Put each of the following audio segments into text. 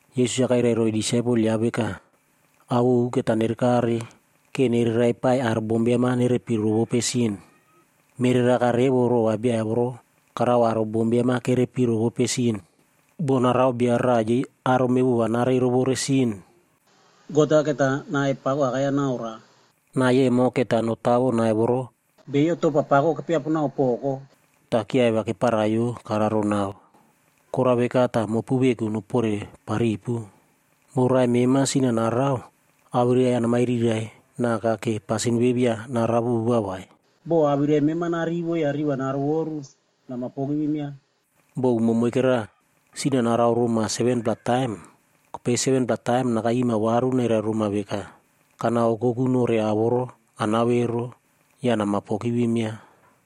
Yesus-a kairai roiy disaipel yaꞌa veka, “Ao ovu keta nerekare ke nere raipaiy aro bombiam-a nerepi rovope sin. Mereraka revo rova bia voro karao aro bombiam-a kerepi rovope sin. Bo narao bia raꞌa yei aro mevova narei rovore sin, God-a keta nai pako akai-ya naroa. Nai emo keta notawo nai voro beiyo topa pako kepiaponao poko ta kyiaivia keparaiyo kararo nao. “Korao veka ta mopu veku noporeparipu. “Bo raꞌai mema sin-a narao, awirai-ya namairirai naka ke pasin ve via narao vova vai. Bo awirai mema narivo ya riꞌi va narovoru, namapogivim yaꞌa. Bo umo moikera, sin-a narao roma 7-pla taim, kopei 7-pla taim nakairima varu nairai roma veka, ‘Kanaokokunore ao voro anao ero,’ ya namapogivim yaꞌa.”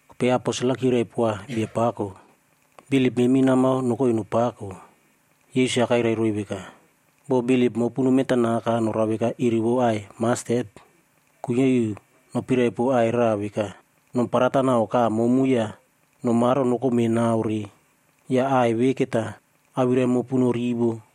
Kopei aposel-a kyirai poa Biapako, “Bilip memi namao nokoi nopako.” Yesus-a kairai roiy veka, “Bo bilip mopu nomentanaka norao veka iri vou aꞌai mastet,a kuinyia iu nopirai pow aꞌai raꞌa veka, ‘Nom parataw nau kaꞌa momu ya nomaro nokome nao re.’ Ya aꞌai ve keta awirai mopu norivo.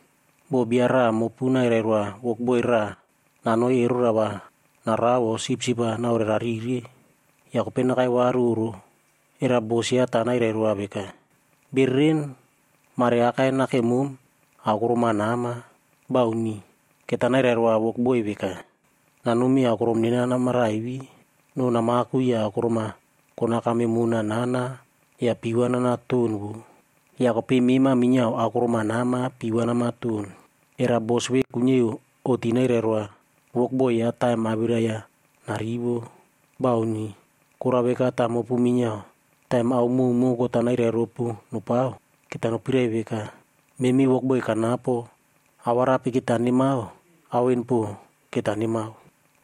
“Bo bia raꞌa mopu nairai roa wokboib raꞌa nanoi erora va narao o sipsip-a naorerarire, ya kopei nakai varu oꞌro, era bos yaꞌa ta nairai roa veka, ‘Bereren, mare akai nakemom aokorom-a nama?’ Bauni. Keta nairai roa wokboi veka, ‘Nanomi aokorom nena namaraivi, no namaku ya aokorom-a konakam mona nana ya pii va nanaton voꞌo. Ya kopei mema minyiao aokorom-a nama pii va namaton.’ Era bos ve kuinyia iu oꞌti nairai roa wokboi yaꞌa taim awirai yaꞌa narivo? Bauni. Korao veka ta mopu minyiao, taim ao mowmow God-a nairai ropu nopao, keta nopirai veka, ‘Memi wokboi kanapo, awarape keta nemao, ao en po keta nemao.’”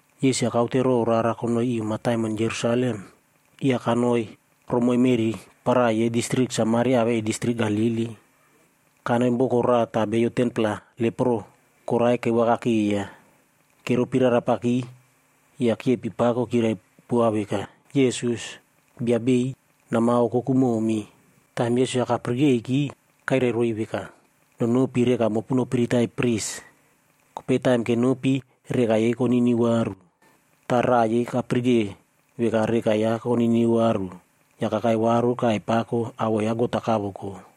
Yesus-a kaute row rara konoi iu mataimon Jerusalem, ya kanoiromoiy meꞌri para yei distrik Samaria awei distrik Galili. Kanoi boko raꞌa ta beiyo 10-pla leproc koraie kevakakeiya. Keropi rarapaki, ya kyepi pakod kyirai poa veka, “Yesus, Bia beiy, nama okoku momi.” Taim Yesus-a kapirikeiki kairai roiy veka, “Nonopi reka mopu nopiritai pris.e Kopei taim kenopi, reka yei koniniu varu.” Ta raꞌa yei kapirike veka reka yaꞌa koniniu varu, ya kakai varu kaiy pako awoꞌo ya God-a kavoko.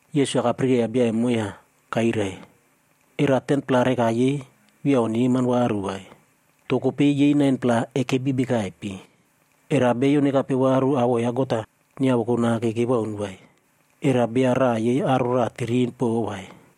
Yesus-a kapirikeiya bia emo ya kairai, “Era 10-pla reka yei via oneman varu vai? To kopei yei 9-pla ekepi bekaipe? Era beiyo nekape varu awoꞌo ya God-a nyiavoko nake kewaun vai? Era bia raꞌa yei aro raꞌa tirin po vai?”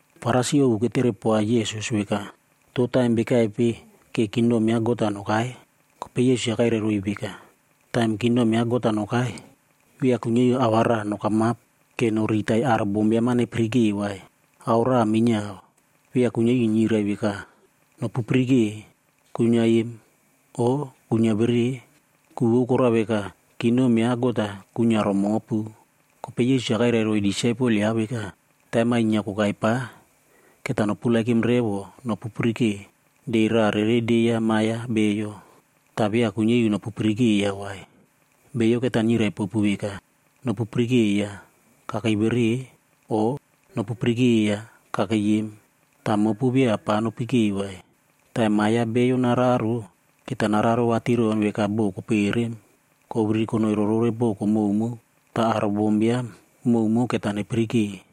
Farisi ovu ketere poa Yesus veka, “To taim bekaipe ke kingdom ya God-a nokai?” Kopei Yesus-a kairai roiy veka, “Taim kingdom ya God-a nokai, via kuinyia iu ao va raꞌa nokamap ke noriritai aro bombiam-a nepirike vai. Ao raꞌa minyiao, via kuinyia iu nyirai veka, ‘Nopu pirike, kuinyia em’, o ‘Kuinyia vere.’ Ku vou korao veka kingdom ya God-a kuinyia romopu.” Kopei Yesus-a kairai roiy disaipel yaꞌa veka, “Taim-a inyia kokai pa, keta noperepow revo nopupirike de raꞌa rere de ya Ma ya Bio. Ta via kuinyia iu nopupirikeiya vai. Beiyo keta nyirai popu veka, ‘Nopu pirikeiya, kakei vere,’ o ‘Nopu pirikeiya kakei em!’ Ta mopu via pa nopikei vai. Taim Ma ya Bio nararo, keta nararo vatiron veka bo koperem koviriri konoi rorore boko mowmow ta aro bombiam mowmow keta nepirike.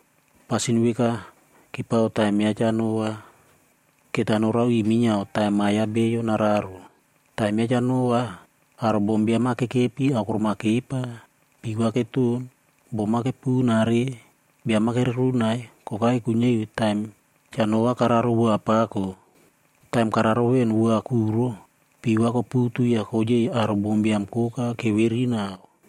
“Pasin veka kepao taim ya Cha Noa,f keta norao iu minyiao taim Ma ya Bio nararo. Taim ya Cha Noa, aro bombiam-a kekepi aokorom-a kepa, pii va keton, bom-a kepunare, biam-a kererunai kokai kuinyia iu taim Cha Noa kararo wua pako. Taim kararo ven wua kuro, pii va koputu ya koyei aro bombiam koka keviri nau.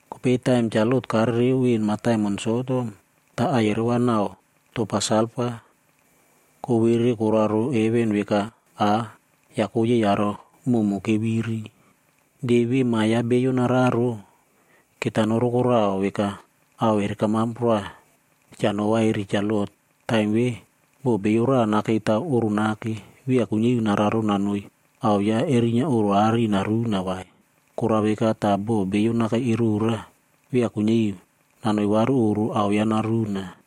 Kopei taim Cha Lot karereo ven mataimon Sodom, ta aiyerao va nau topa salfa kowere koraro heven veka aꞌ ya koyei aro mowmow keviri. “De ve Ma ya Bio nararo, keta norokorao veka ao erekamap roa Cha Noa eri Cha Lot. Taim ve, bo bio raꞌa nakei taw oꞌro nake,h via kuinyia iu nararo nanoi ao yaꞌa erinyia oꞌro aꞌari naruna vai. Korao veka ta bo bio nakei erora, via kuinyia iu nanoi varu oꞌro ao yaꞌa naruna.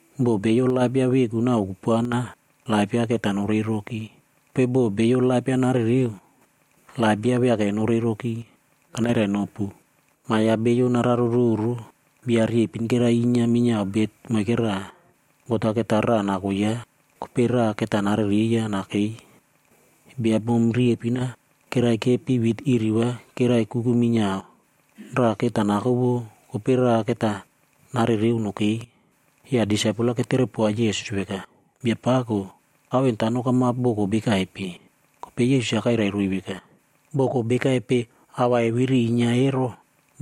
Bo bio laip yaꞌa veku navo kupuana, laip yaꞌa keta norei roki. Kopei bo bio laip yaꞌa narereo, laip yaꞌa viake norei roki. “Kanairainopu, Ma ya Bio nararo roro, bia riepin kerai inyia minyiao bet moikera, God-a keta raꞌa nako yaꞌa, kopei raꞌa keta narereiya nakei. Bia bom riepin-a kerai kepi wit iri va kerai kuku minyiao, raꞌa keta nako vou, kopei raꞌa keta narereo nokei.” Ya disaipel-a keterepoa Yesus veka, “Biapako, ao en ta nokamap boko bekaipe?” Kopei Yesus-a kairai roiy veka, “Boko bekaipe ao va eviri inyia ero,